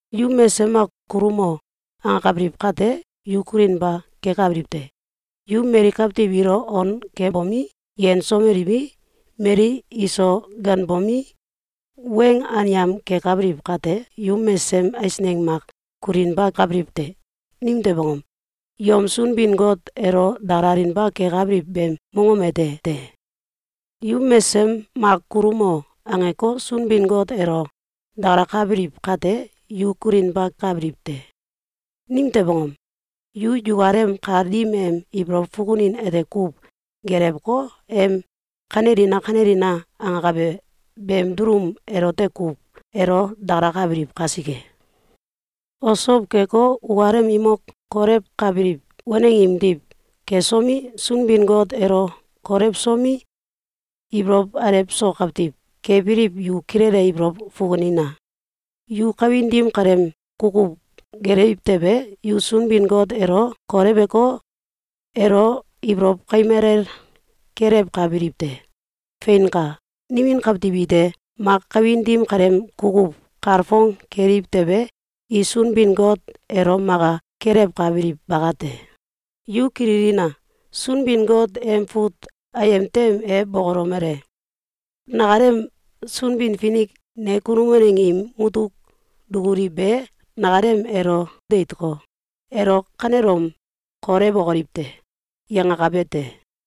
Yu mesesem mak “Kulumo!”, angakabiliw kate, yu kulinba kekabiliw te. Yu mali kawtiw ilo on kebomi, yensomeliwi, mali iso ganbomi, weng anyam kekabiliw kate, yu mesesem eisneng mak kulinba kabiliw te. Nimtew angom? Yom Sunbin-Got elo dakalalinba kekabiliw beem mongom ete te. Yu mesesem mak “Kulumo!”, angeko, Sunbin-Got elo dakalakabiliw kate, yu kulinba kabiliw te. Nimtew angom? Yu yukalem kal dim em ibolow fukunin ete kuw gelewko, em “Kanelina! Kanelina!” angakabe beem dulum elote kuw elo dakalakabiliw kasike. Osow keko, ukalem imok kolewkabiliw waneng imdiw kesomi, Sunbin-Got elo kolewsomi, ibolow alew so kawtiw kebiliw yu kilele ibolow fukunina! Yu kawin dim kaleem kukuw gelewiw tewe, yu Sunbin-Got elo koleweko, elo ibolow kaim alel kelewkabiliw te. Feinka! Nimin kawtiw ite mak kawin dim kaleem kukuw kalfong keliw tewe, i Sunbin-Got elo maka kelewkabiliw bakate. Yu kililina! Sunbin-Got em fut ayem tem e bokolomele: “Nakalem Sunbin-Finik ne kunum waneng im mutuk dukuli be nakalem elo deitko, ‘Elo kanelom kolewokoliw te!’, yangakabe te.”,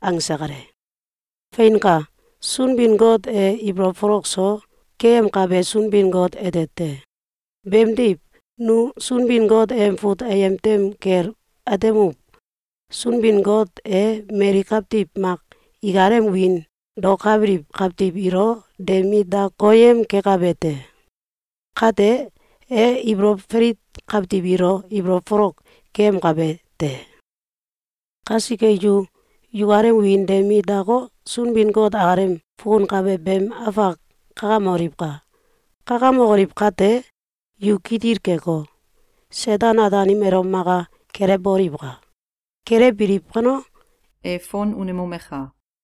angse kale. Feinka! Sunbin-Got e ibolow folok so keyemkabe Sunbin-Got ete te. Beemdiw, nu Sunbin-Got em fut ayem tem kel atemuw: “Sunbin-Got e mali kawtiw mak ikalem wiin daokabiliw kawtiw ilo de mit da koyem kekabe te. Kate, e ibolow falit kawtiw ilo ibolow folok keyemkabe te.” Kasike, yu yukalem wiin de mit dako, Sunbin-Got akalem fukunkabe beem afak kakamoliwka! Kakamokoliw kate, yu kitil keko, Seten-Ataanim elo maka kelewboliwka! Kelewbiliw kano, e fon unemomeka!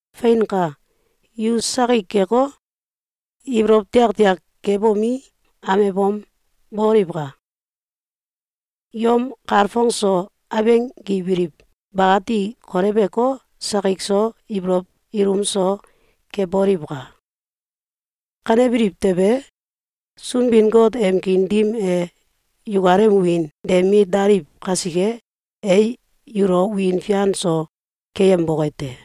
Feinka! Yu sakik keko, ibolow tiaktiak kebomi, amebom, boliwka! Yom kalfong so abenggibiliw bakati koleweko, sakik so ibolow ilum so keboliwka! Kanebiliw tewe, Sunbin-Got em kiin dim e yukalem wiin de mit daliw kasike, e yulo wiin fian so keyemboke te.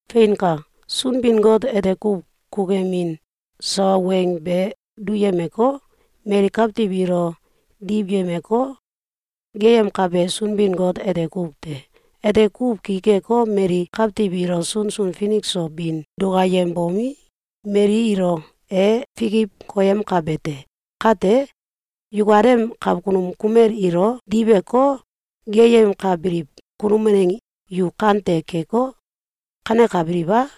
Feinka! Sunbin-Got ete kuw kukuyemin sawa weng be duyemeko, mali kawtiw ilo diwyemeko, geeyemkabe Sunbin-Got ete kuw te. Ete kuw ki keko, mali kawtiw ilo sunsun finik so bin dukayembomi, mali ilo e fikiw koyemkabe te. Kate, yukalem awkunum kumel ilo diweko, geeyemkabiliw kunum waneng yu kante keko, kanekabiliw a?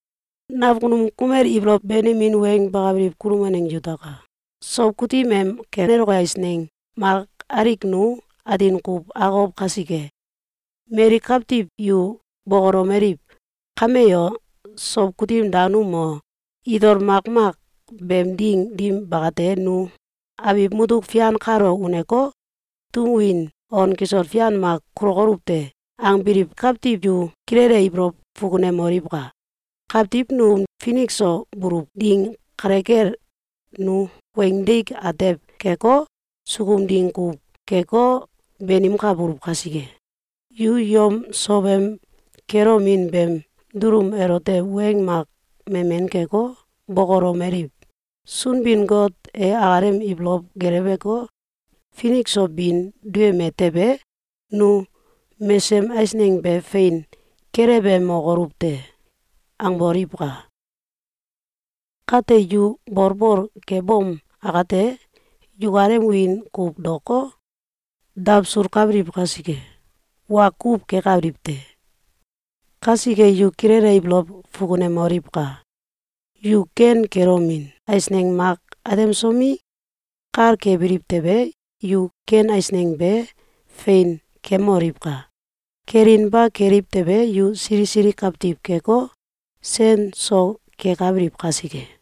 Nakunum kumel ibolow benemin weng bakabiliw kunum waneng yutaka! Sow kutim em keloke eisneng mak alik nu atin kuw akokow kasike, mali kawtiw yu bokolomeliw: “Kame o, sow kutim danum o, itol makmak beem ding dim bakate, nu abiw mutuk fian kalo uneko, tum win on kisol fian mak kulokoluw te!”, angbiliw kawtiw yu kilele ibolow fukunemoliwka! Kawtiw num finik so buluw ding kale kel, nu weing deik atew keko, sukum ding kuw keko, banimkabuluw kasike, yu yom sowem kelomin beem dulum elote weng mak memen keko, bokolomeliw: “Sunbin-Got e akalem ibolow geleweko, finik so bin duyeme tewe, nu mesesem eisneng be fein kelewemokoluw te.”, angboliwka! Kate, yu bolbol kebom akate, yukalem wiin kuw daoko, dawsulkabiliw kasike, wa kuw kekabiliw te. Kasike, yu kilele ibolow fukunemoliwka! Yu ken kelomin eisneng mak atemsomi, kal kebiliw tewe, yu ken eisneng be fein kemoliwka! Kelinba keliw tewe, yu sili sili kawtiw keko, sen so kekabiliw kasike.